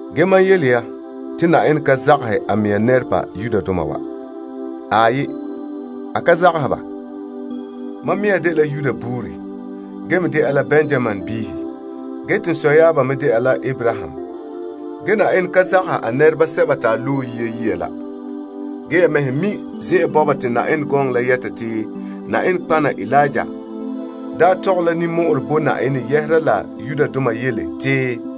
Ge mam yele ya te Yenɛ ka zagahɛ a mea nɛreba Israeldoma. Aai. Mam mea dela Israel nɛra ge me dɛna Benyaminbiihe. Te n sɔyaaba me da la Abraham. Ge Yenɛ ka zagahɛ a nɛreba sɛba te a daa loe yia la. Ge ya mɛhe mi' zen'an bɔba te Yenɛ gɔŋɔ la yɛta te nɔtɔgɔha Eliya daa tɔgɛ la ninmɔ'ɔrɛ bo Yenɛ yɛhera la Israeldoma yele te,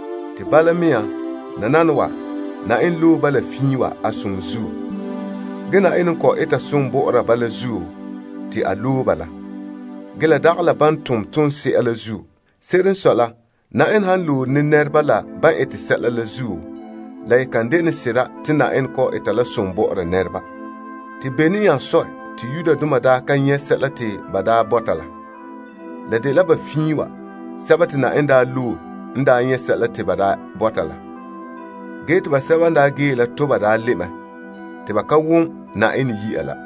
Bala mea, nananawa te Yenɛ n loe sɛba n fiin wa yee a som zuo. Ge Yenɛ n kɔ'ɔn eta som bɔ'ɔra ba la zuo, te a loe ba la. Ge la dagɛ la ban tom toonse'a la zuo. Se'ere n sɔe la, Yenɛ han loore ne nɛreba la ban ete sɛla la zuo, la ye kan dene sera te Yenɛ kɔ'ɔn eta la som bɔ'ɔra nɛreba. Te bene nya sɔe te Israeldoma daa ka nyɛ' sɛla te ba bɔta la? La dela ba fiin wa, sɛba te Yenɛ daa loe n daa nyɛ' sɛla te ba daa bɔta la. Ge te basɛba n daa yee la toba daa le' mɛ te ba ka wom Yenɛ yi'a la.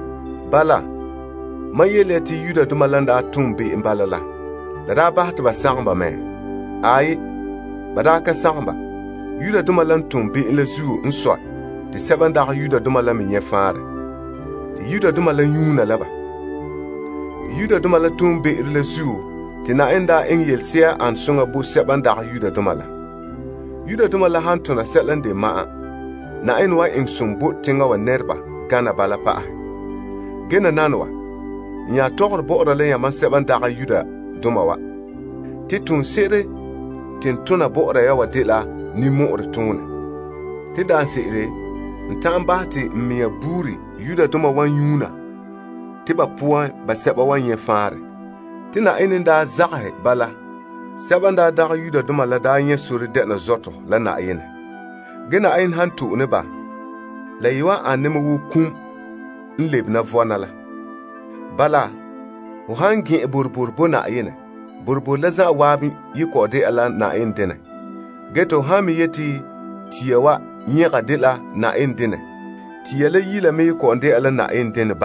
Bala, mam yele ya te ba n daa tom be'em bala la, la daa bahɛ te ba sagom ba mɛ? Aai. Yudoma la n ton be'em la zuo n sɔe te sɛba n dagɛ Yudoma la me nyɛ' faanrɛ, te Israeldoma la nyuuna la ba. Te Yudoma la toonbe'ero la zuo te Yenɛ daa eŋɛ yelese'a n ane soŋa bo sɛba n dagɛ Yudoma la. Yudoma la han tona sɛla n de ma'an, Yenɛ wan eŋɛ som bo teŋa wa nɛreba gane bala pa'ahɛ. Ge nananawa, n nya tɔgɔre bɔ'ɔra la yamam sɛba n dagɛ Yudoma wa, te toonse'ere te n tona bɔ'ɔra ya wa dela ninmɔ'ɔrɛ toonɛ. Te daanse'ere n ta'an bahɛ te n mea buuri Yudoma wa nyuuna te ba poan basɛba wan nyɛ' faanrɛ. Te Yenɛ n daa zagahɛ ba la, sɛba n daa dagɛ Yudoma la daa nyɛ' sore dɛna zɔtɔ la Yenɛ. Nananawa Yenɛ han wan to'e ba, la wan ane wo kum n le lebe vɔna la. Bala, ho han gɛn'ɛn boroboro dideema bo Yenɛ, boroboro la zanwaabe ye kɔ'ɔn de'a toolom bo Yenɛ. Ge te ho han me yeti tia wa nyɛga dela Yenɛ denɛ, tia la zan'an kɔ'ɔn de'a la a denɛ.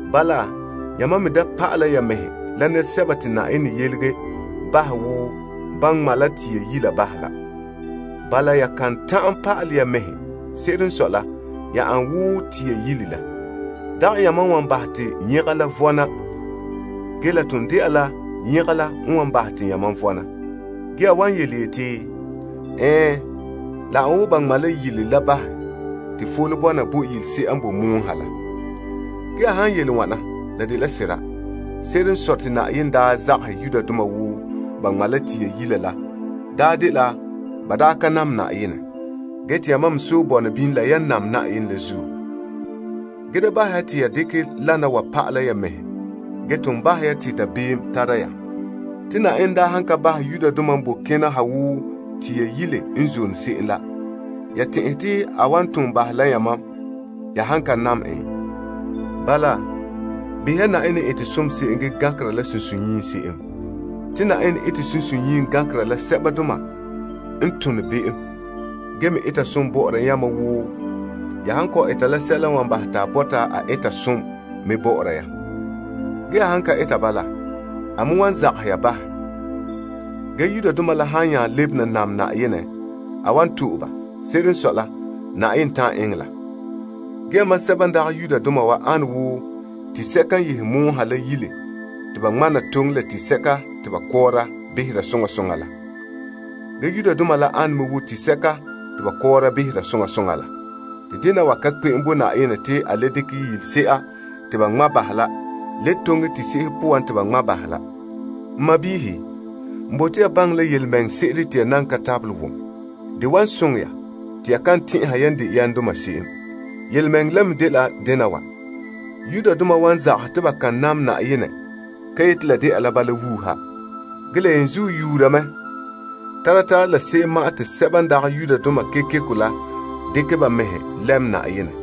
Bala, yamam me da pa'ala ya mɛhe la nɛresɛba te Yenɛ yelege bahɛ wo ba ŋma' la tia yila bahɛ la. Bala, ya kan ta'an pa'ala ya mɛhe. Se'ere n sɔe la, ya ane me wo tia yile la. Dagɛ yamam n wan bahɛ te nyɛga la vɔna ge la ton de'a la nyɛga la n wan bahɛ te yamam vɔna. Ge ya wan yeti, Ɛɛn, la ane wo ba ŋma' la yila la bahɛ te fole bɔna bo yilese'ere n boe mɔɔ ha la. Ge ya han yele wana la de sera. Se'ere n sɔe te Yenɛ daa zagahɛ Yudoma wo ba ŋma' tia yile la daa dela ba daa ka nam Yenɛ. Ge te yamam me sɔe bɔna bini la yan nam Yenɛ la zuo. Ge da bahɛ ya te ya dekɛ wana wa pa'ala la ya mɛhe. Ge ton bahɛ ya te dabeem tara ya. Te Yenɛ daa han ka bahɛ Yudoma n boe kena ha wo tia yila n zo'ore se'em la ya tɛn'ɛhe te a wan ton bahɛ la yamam ya han ka nam en? Bala, behɛ ya Yenɛ n ete som ge me gankera la sunsunyiim se'em. Te Yenɛ ete sunsunyiim gankera la sɛbadoma n tone be'em. Ge me ete som bɔ'ɔra yamam wo ya han kɔ'ɔn eta sɛla n wan bahɛ te a bɔta a eta som me bɔ'ɔra ya. Ge ya han ka eta bala, a me wan zagahɛ ya bahɛ. Ge Yudoma la han nya lebena nam Yenɛ, a wan le to'e ba. Se'ere n sɔe la, Yenɛ ta'an eŋɛ la. Ge yamam sɛba n dagɛ Yudoma wa ane wo tisɛka n yehe mɔɔ ha la yile te ba ŋma' na toŋe la tisɛka te ba kɔɔra behera soŋa soŋa la. Ge Yudoma la ane me wo tisɛka te ba kɔɔra behera soŋa soŋa la. Te dena wa ka kpe'em bo Yenɛ te a le dekɛ yila te ba ŋma' bahɛ la le toŋe tisɛka poan te ba ŋma' ba la. N sɔɔnrɔ, n bote ya baŋɛ la yelemɛŋɛrɛ se'ere te ya nan ka tabelɛ wom. De wan soŋɛ ya te ya kan tɛn'ɛha yan de yamdoma se'em. Yelemɛŋɛrɛ la me dela dena wa: Israeldoma wan zagahɛ te ba kan nam Yenɛ ka yeti la de'a la bala wuuha. Ge la yenzuo yuura mɛ tara tara la se'em ma'an te sɛba n dagɛ Yudoma kekeko la dekɛ ba mɛhe lɛm Yenɛ.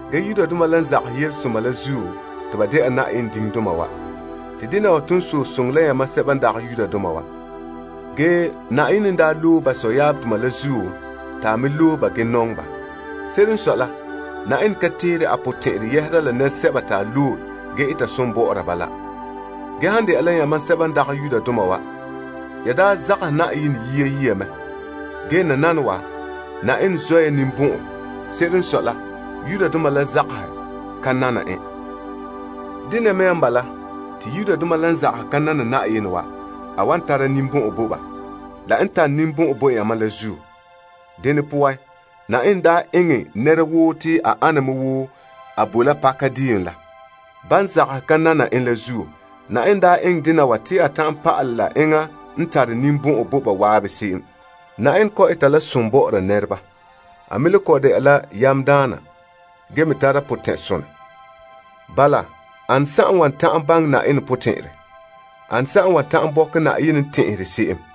Ge Yudoma la n zagahɛ yelesoma la zuo, te ba de'a Yenɛ diŋdoma wa. Te dena wa ton sɔe soŋɛ la yamam sɛba n dagɛ Yudoma wa. Ge Yenɛ n daa loe ba sɔyaabdoma la zuo te a me loe ba ge nɔŋɛ ba. Se'ere n sɔe la, Yenɛ ka teere a potɛn'ɛrɛ yɛhera la nɛresɛba te a loe ge eta som bɔ'ɔra ba la. Ge han dɛna la yamam n daa zagahɛ Yenɛ yia mɛ, nananawa Yenɛ zɔ ya ninbɔn'ɔn, ba zagahɛ ka nana en la zuo. Dene mea n bala, te Yudoma la n zagahɛ ka nana Yenɛ wa, a wan tare ninbɔn'ɔn bo ba, la n tare ninbɔn'ɔn bo yamam la zuo. Dene poan, Yenɛ daa eŋɛ nɛra woo te a ana wo a boe la paka deo poan la, ban zagahɛ ka nane en la zuo. Yenɛ daa eŋɛ dena wa te a ta'an pa'alɛ la enŋa n tare ninbɔn'ɔn bo ba waabe se'em. Yenɛ kɔ'ɔn ete la som bɔ'ɔra nɛreba. A me le kɔ'ɔn dɛna la yamdaana ge me tara potɛn'sonɛ. Bala, ane n wan ta'an baŋɛ Yenɛ potɛn'ɛrɛ? Ane n wan ta'an bɔkɛ Yenɛ n tɛn'ɛhere se'em?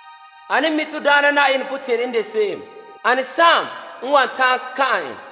Ane n mi' to Daana Na'ayenɛ potɛn'ɛrɛ n de se'em? Ane n wan ta'an kan'an en?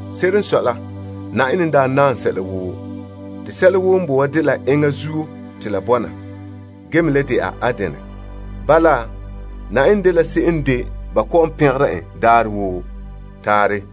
Se'ere n sɔe la Yenɛ n daa naam sɛla woo. Te sɛla woo n boe wa dela enŋa zuo te la bɔna ge me le de'a a denɛ. Bala, pɛngere ya Yenɛ daarɛ woo. Taarɛ.